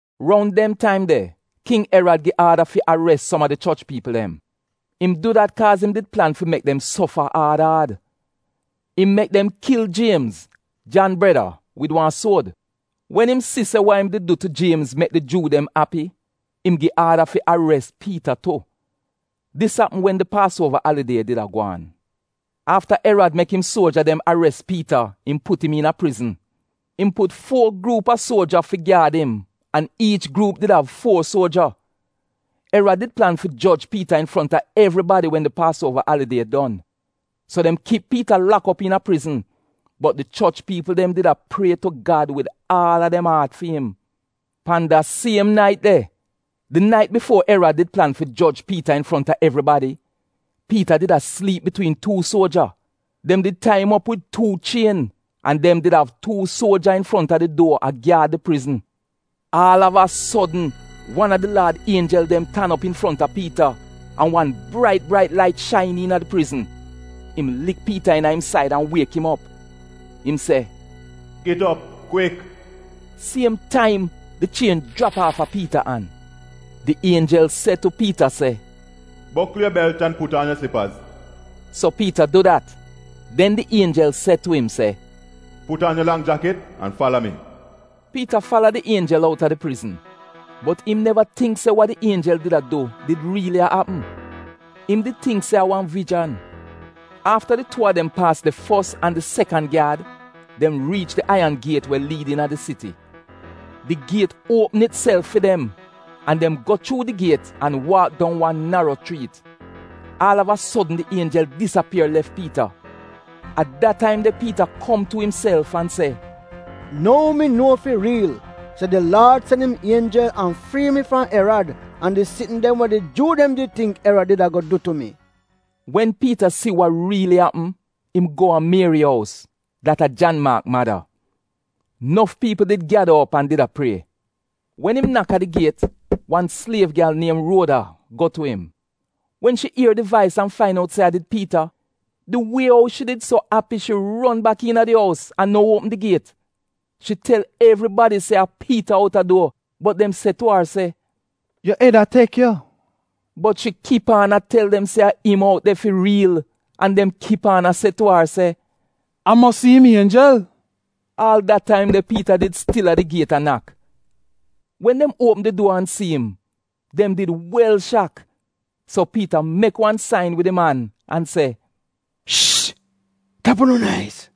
Roun dem taim de, King Erad gi aada fi ares som a di choch piipl dem. Im du dat kaaz im did plan fi mek dem sofa aad aad. Im mek dem kil Jiemz, Jan breda wid wan suod. Wen im si se wa im did du tu Jiemz mek di Juu dem api, im gi aada fi ares Piita tu. Dis apm wen did Paasuova alidie did a gwaan. Afta Erad mek im suoja dem ares Piita im put im iina prizn. Im put fuo gruup a suoja fi gyaad im an iich gruup did av fuo suoja. Erad did plan fi joj Piita infronta evribadi wen di Paasuova alidie don. So dem kip Piita lak op iina prizn, bot di choch piipl dem did a prie tu Gad wid aal a dem aat fi im. Pan da siem nait de, di nait bifuo Erad did plan fi joj Piita infronta evribadi, Piita did a sliip bitwiin tuu suoja. Dem did tai im op wid tuu chien an dem did av tuu suoja infronta di duor a gyaad di prizn. Aal av a sodn wan a di Laad ienjel dem tan op infronta Piita an wan brait brait lait shain iina di prizn. Im lik Piita iina im said an wiek im op. Im se, “Git op, kwik!” Siem taim di chien jrap aafa Piita an. Di ienjel se tu Piita se, “Bokl yu belt an put aan yu slipaz.” So Piita du dat. Den di ienjel se tu im se, “Put aan yu lang jakit an fala mi.” Piita fala di ienjel outa di prizn, bot im neva tingk se wa di ienjel did a du did riili a apm. Im did tingk se a wan vijan. Afta di tuu a dem paas di fos an di sekan gyaad, dem riich di aiyan giet we liid iina di siti. Di giet uopm itself fi dem an dem go chuu di giet an waak dong wan naro chriit. Aal av a sodn di ienjel disapier lef Piita. A da taim de Piita kom tu imself an se, “Nou mi nuo fi riil se di Laad sen im ienjel an frii mi fram Erad an di sitn dem we di Juu dem did tingk Erad did ago du tu mi.” Wen Piita si wa riili apm, im go a Mieri ous, dat a Jan Maak mada. Nof piipl did gyada op an did a prie. Wen im nak a di giet, wan sliev gyal niem Ruoda go tu im. Wen shi ier di vais an fain out se a did Piita, di wie ou shi did so api shi ron bak iina di ous an no uopm di giet. Shi tel evribadi se a Piita outa duor. Bot dem se tu ar se, “Yu ed a tek yu!” Bot shi kip aan a tel dem se a im out de fi riil, an dem kip aan a se tu ar se, “A mosi im ienjel!” Aal da taim de Piita did stil de a di giet a nak. Wen dem uopm di duor an si im, dem did wel shak. So Piita mek wan sain wid im an se, “Shhh, tap unu nais!”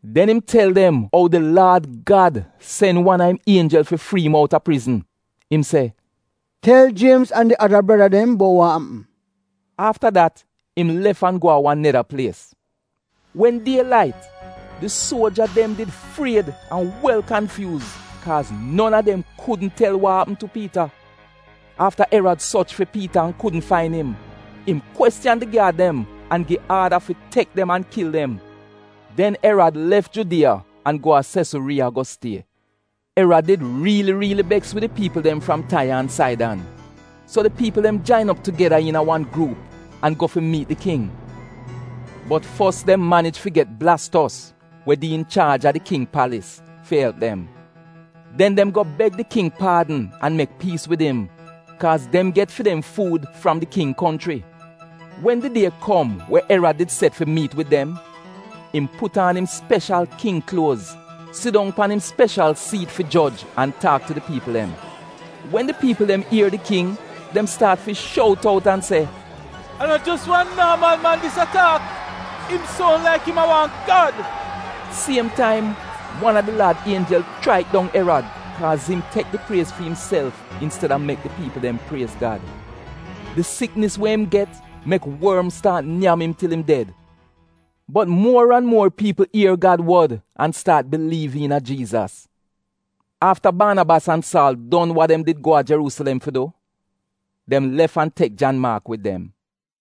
Den im tel dem ou di Laad Gad sen wan a im ienjel an frii im outa prizn. Im se, “Tel Jiemz an di ada breda dem bout wa apm.” Afta dat im lef an go a wan neda plies. Wen die lait di suoja dem did fried an wel kanfyuuz, kaaz non a dem kudn tel wa apm tu Piita. Afta Erad sorch fi Piita an kudn fain im, im kwestiyan di gyaad dem an gi aada fi tek dem an kil dem. Den Erad lef Judiya an go a Sesuriiya go stie. Erad did riili riili beks wid di piipl dem fram Taiya an Saidan. So di piipl dem jain op tugeda iina wan gruup an go fi miit di King. Bot fos dem manij fi get Blastos, we di inchaaj a di king palis, fi elp dem. Den dem go beg di king paadn an mek piis wid im, kaaz dem get fi dem fuud fram di king konchri. Wen di die kom we Erad did set fi miit wid dem, im put aan im speshal king kluoz, sidong pan im speshal siit fi joj an taak tu di piipl dem. Wen di piipl dem ier di king dem staat fi shout out an a se, “A no jos wan aadineri man dis a taak, im soun laik im a wan gad.” Siem taim wa a di Laad ienjel chraik dong Erad kaaz im tek di priez fi imself insteda mek di piipl dem priez Gad. Di siknis we im get mek worm staat nyam im til im ded. Bot muor an muor piipl ier Gad wod an staat biliiv iina Jiizas. Afta Baanabas an Saal don wa dem did go a Jeruusilem fi du, dem lef an tek Jan Maak wid dem.